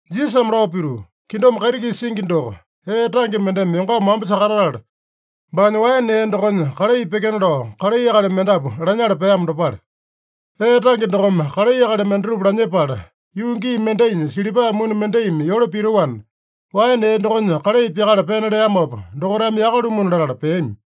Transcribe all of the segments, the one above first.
Jisasame lao pituu, “Kingdom kaiti-kisa singi doko, ee tange mendeme yongama wamba sakatatala, baanya waene ee dokonya kalai pyekena lao, kalai akali mendapu lanyala peamo dopale. Ee tange dokome kalai akali mendatupa lanyepala, yuu gii mendainya silipa muni mendaimi yole pitoana, waene ee dokonya kalai pyakala pena leamopa, dokaitame yaka-lumuna latala peami.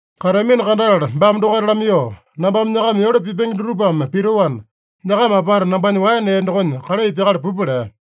Kateamino kandatala baame dokaita lamaiyoo, ‘Nambame nyakama yole pipenge dutupame pitoana, nyakama apata nambanya waene ee dokonya kalai pyakala pupa’ lea.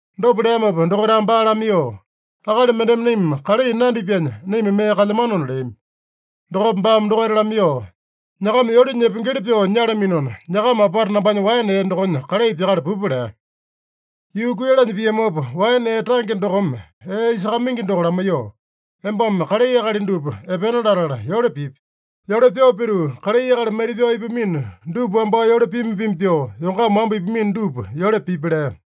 Dopa leamopa dokaitame baa lamaiyoo, ‘Akali mendeme naima kalai nandipyanya, naima mee kalyamanona’ leami. Dokopa baame dokaita lamaiyoo, ‘Nyakama yole nyepengeli pyoo nyalaminona, nyakama apata nambanya waene ee dokonya kalai pyakala pupa’ lea. “Yuu kuiyalanya piamopa, waene ee tange dokome ee isakamaingi doko lamaiyoo, ‘Embame kalai akali dupa epena latala yole pipi. Yole pyoo pituu, kalai akali maita-pyao ipamino dupa wambao yole pima-pima pyoo, yongama wamba ipamino dupa yole pipi’ lea.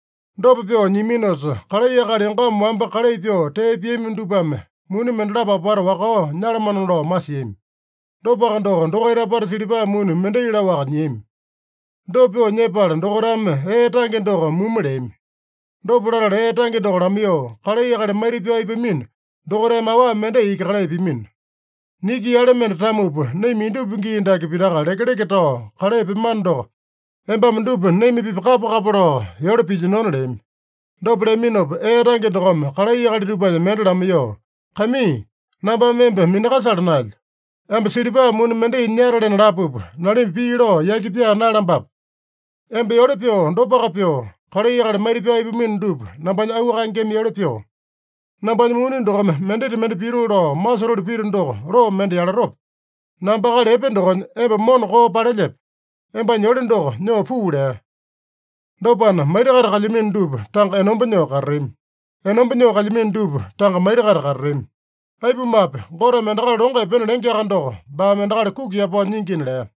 Dopa pyoo nyiaminosa, kalai akali yongama wamba kalai pyoo tee piami dupame muni mendalapo apata wakao nyalamano lao masiami. Dopaka doko, dokaita apata silipa muni mendai laowaka nyiami. Dopa pyoo nyepala, dokaitame ee tange doko mumu leami. Dopa latala ee tange doko lamaiyoo, ‘Kalai akali maita-pyao ipamino dokaitame awa mendai iki kalai pimino. Niki yale mende tamupa, naima indupa gii dake pitaka lekeleke tao kalai pyemano doko, embame dupa naima-pipa kapa-kapa lao yole pilyinona’ leami. Dopa leaminopa, ee tange dokome kalai akali dupanya mende lamaiyoo, ‘Kaimii, nambame emba minakasala naelyo. Emba silipa muni mendai nyatalena lapupa, nalimba pii lao yaki pyaa naeyalambape? Emba yole pyoo dopaka pyoo, kalai akali maita-pyao ipamino dupa nambanya auu kaengeme yole pyoo. Nambanya muni dokome mendita mende pitoo lao masotoli pito doko, loo mende yalatope? Namba akali epe dokonya, emba mona koo palelyepe? Embanya yole doko nyoo puu’ lea. Dopana, maita-kaita kalyamino dupa tanga enomba nyoo katatami. Enomba nyoo kalyamino dupa tanga maita-kaita katatami. Aipumape, Goteme endakali longo epena lengeaka doko, baame endakali kuki yapao nyingina” lea.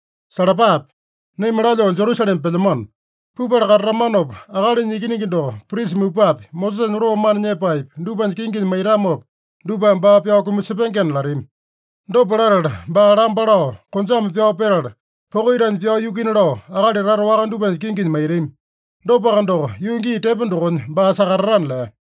“Salapape! Naima lalyoo Jerusalema pelyamano. Pupala katatamanopa, Akalinya Ikiningi doko prisa mupapi, Mosesanya loo mana nyepaepi, dupanya kinginya maitamopa, dupame baa pyao kumasepengena latami. Dopa latala, baa lamba lao, konjame pyao petala, poko itanya pyao yukuina lao, akali tata waka dupanya kinginya maitami. Dopaka doko, yuu gii tepo dokonya baa sakatatana” lea.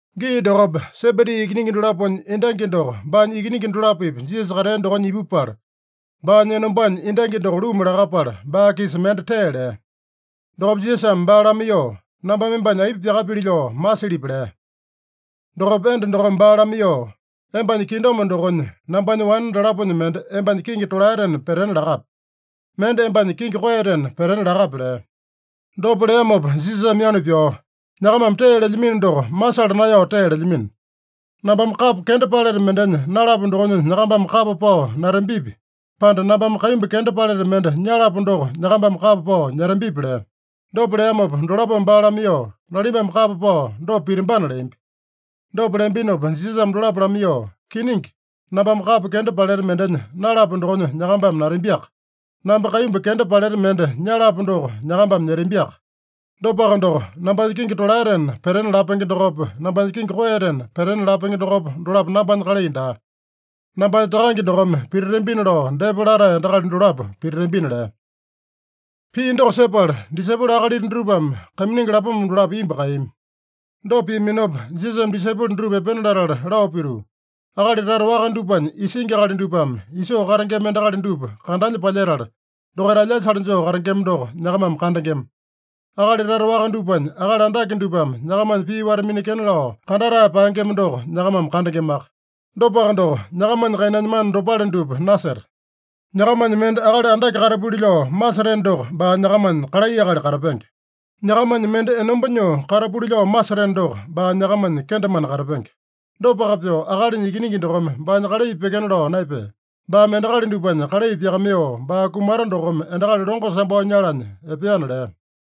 Gii dokopa, Sebedi ikiningi dolaponya endangi doko baanya ikiningi dolapo-pipa Jisasa katea dokonya ipupala, baanya enombanya endangi doko luma lakapala, baa-kisa mende tee lea. Dokopa Jisasame baa lamaiyoo, “Nambame embanya aipa pyakapili lao masilyipi?” lea. Dokopa enda dokome baa lamaiyoo, “Embanya kingdom dokonya, nambanya wane dalaponya mende embanya kingi tolaetena petena lakape. Mende embanya kingi koeyatena petena lakape” lea. Dopa leamopa Jisasame yanu pyao, “Nyakamame tee lelyamino doko masala naeyao tee lelyamino. Nambame kapo kenda paleta mendenya nalapo dokonya nyakambame kapa pao natambipi, pande nambame kaimbu kenda paleta mende nyalapo doko nyakambame kapa pao nyetambipi?” lea. Dopa leamopa dolapome baa lamaiyoo, “Nalimbame kapa pao dopa pitambana” leambi. Dopa leambinopa Jisasame dolapo lamaiyoo, “Kiningi, nambame kapo kenda paleta mendenya nalapo dokonya nyakambame natambiaka. Namba kaimbu kenda paleta mende nyalapo doko nyakambame nyetambiaka. Dopaka doko, nambanya kingi tolaetena petena lapenge dokopa, nambanya kingi koeyatena petena lapenge dokopa, dolapo nambanya kalai daa. Nambanya Takange dokome pititambina lao depa latae endakali dolapo pititambina” lea. Pii doko sepala, disaipolo akalita dutupame kaiminingi lapoma dolapo imbu kaeyami. Dopa piaminopa, Jisasame disaipolo dutupa epena latala lao pituu, “Akali tata waka dupanya isingi akali dupame isoo katengema endakali dupa kandanya palyetala, dokaita alyasale joo katengema doko nyakamame kandengema. Akali tata waka dupanya akali andake dupame nyakamanya pii wata-minekena lao kandatae paengema doko nyakamame kandengemaka. Dopaka doko, nyakamanya kainanya mana dopale dupa naseta. Nyakamanya mende akali andake katapuli lao maseteno doko, baa nyakamanya kalai akali katapenge. Nyakamanya mende enomba nyoo katapuli lao maseteno doko, baa nyakamanya kendemane katapenge. Dopaka pyoo, Akalinya Ikiningi dokome baanya kalai pyekena lao naepea. Baame endakali dupanya kalai pyakamaiyoo, baa kumata dokome endakali longo sambao nyalanya epeana” lea.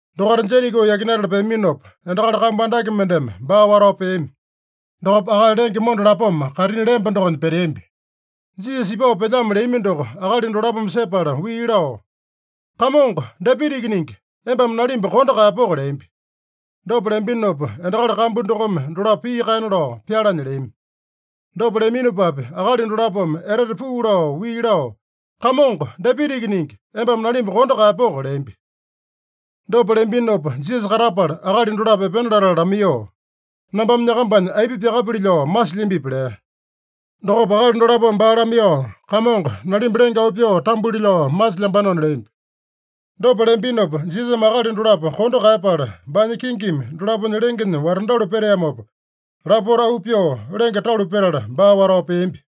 Dokaita Jeriko yakinatala peaminopa, endakali kambu andake mendeme baa watao peami. Dokopa akali lenge monda lapoma kaitini lemba dokonya peteambi. Jisasa ipao pelyamo leami doko akali dolapome sepala wii lao, “Kamongo, Dapita Ikiningi, embame nalimba kondo kaeyapoko!” leambi. Dopa leambinopa, endakali kambu dokome dolapo pii kaena lao pyalanya leami. Dopa leaminopapi, akali dolapome etete puu lao wii lao, “Kamongo, Dapita Ikiningi, embame nalimba kondo kaeyapoko!” leambi. Dopa leambinopa Jisasa katapala, akali dolapo epena latala lamaiyoo, “Nambame nyakambanya aipa pyakapili lao masilyambipi?” lea. Dokopa akali dolapome baa lamaiyoo, “Kamongo, nalimba lenge auu pyoo tambuli lao masilyambanona” leambi. Dopa leambinopa, Jisasame akali dolapo kondo kaeyapala, baanya kingimi dolaponya lengenya watandalu peteamopa, lapota auu pyoo lenge talu petala, baa watao peambi.